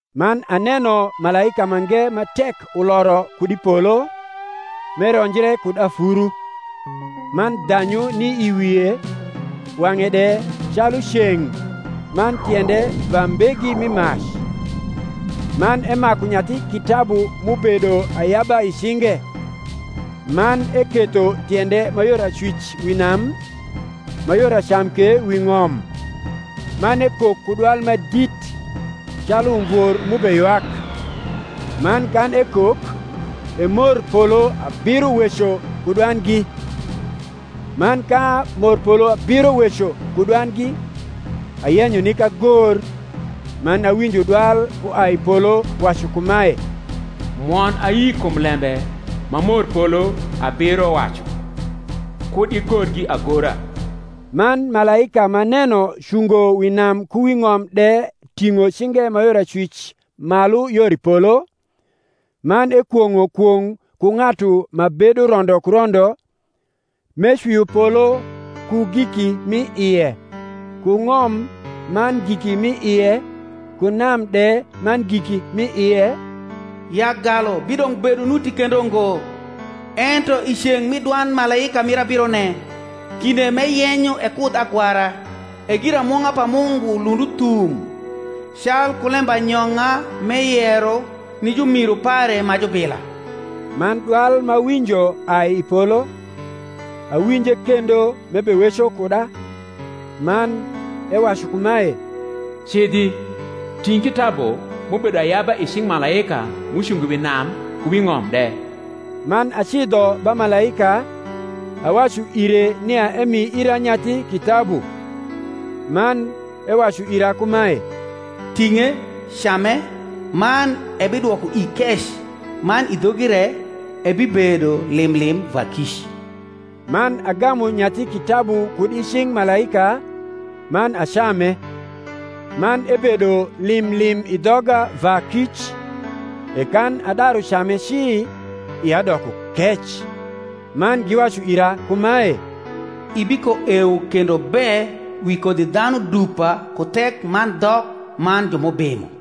Man aneno malaika mange ma tek uloro kud i polo, m’eronjre kud afuru; man dhanyu ni i wie, wang’e de calu ceng’, man tiende va mbegi mi mac; man emaku nyathi kitabu m’ubedo ayaba i cinge: man eketho tiende ma yor acwic wi nam, ma yor acam ke wi ng’om; man ekok ku dwal ma dit, calu umvor m’ubeywak: man kan ekok, e morpolo abiro weco ku dwandgi. Man ka morpolo abiro weco ku dwandgi, ayenyo nik agor: man awinjo dwal uai i polo wacu kumae, Mwon ayi kum lembe ma morpolo abiro wacu, kud igorgi agora. Man malaika m’aneno cungo wi nam ku wi ng’om de ting’o cinge ma yor acwic malu yor i polo, man ekwong’o kwong’ ku ng’atu ma bedo rondo ku rondo, m’ecwio polo ku giki m’i ie, ku ng’om man giki m’i ie, ku nam de man giki m’i ie, ya galu bidong’ bedo nuti kendo ngo: ento i ceng’ mi dwand malaika mir abirone, kinde m’eyenyo ekudh agwara, e giramung’a pa Mungu lund uthum, calku lembanyong’a m’eyero ni jumiru pare ma jubila. Man dwal m’awinjo ai i polo, awinje kendo m’ebeweco kuda, man ewacu kumae, Cidhi, ting’ kitabu m’ubedo ayaba i cing’ malaika m’ucungo wi nam ku wi ng’om de. Man acidho ba malaika, awacu ire nia emi ira nyathi kitabu. Man ewacu ira kumae, Ting’e, came; man ebidwoko ii kec, mana i dhogi re ebibedo lim lim va kic. Man agamu nyathi kitabu kud i cing’ malaika, man acame; man ebedo lim lim i dhoga va kic: e kan adaru came ci, ia doko kec. Man giwacu ira kumae, Ibikoewo kendo be wi kodhidhanu dupa ku thek man dhok man ju m’ubimo.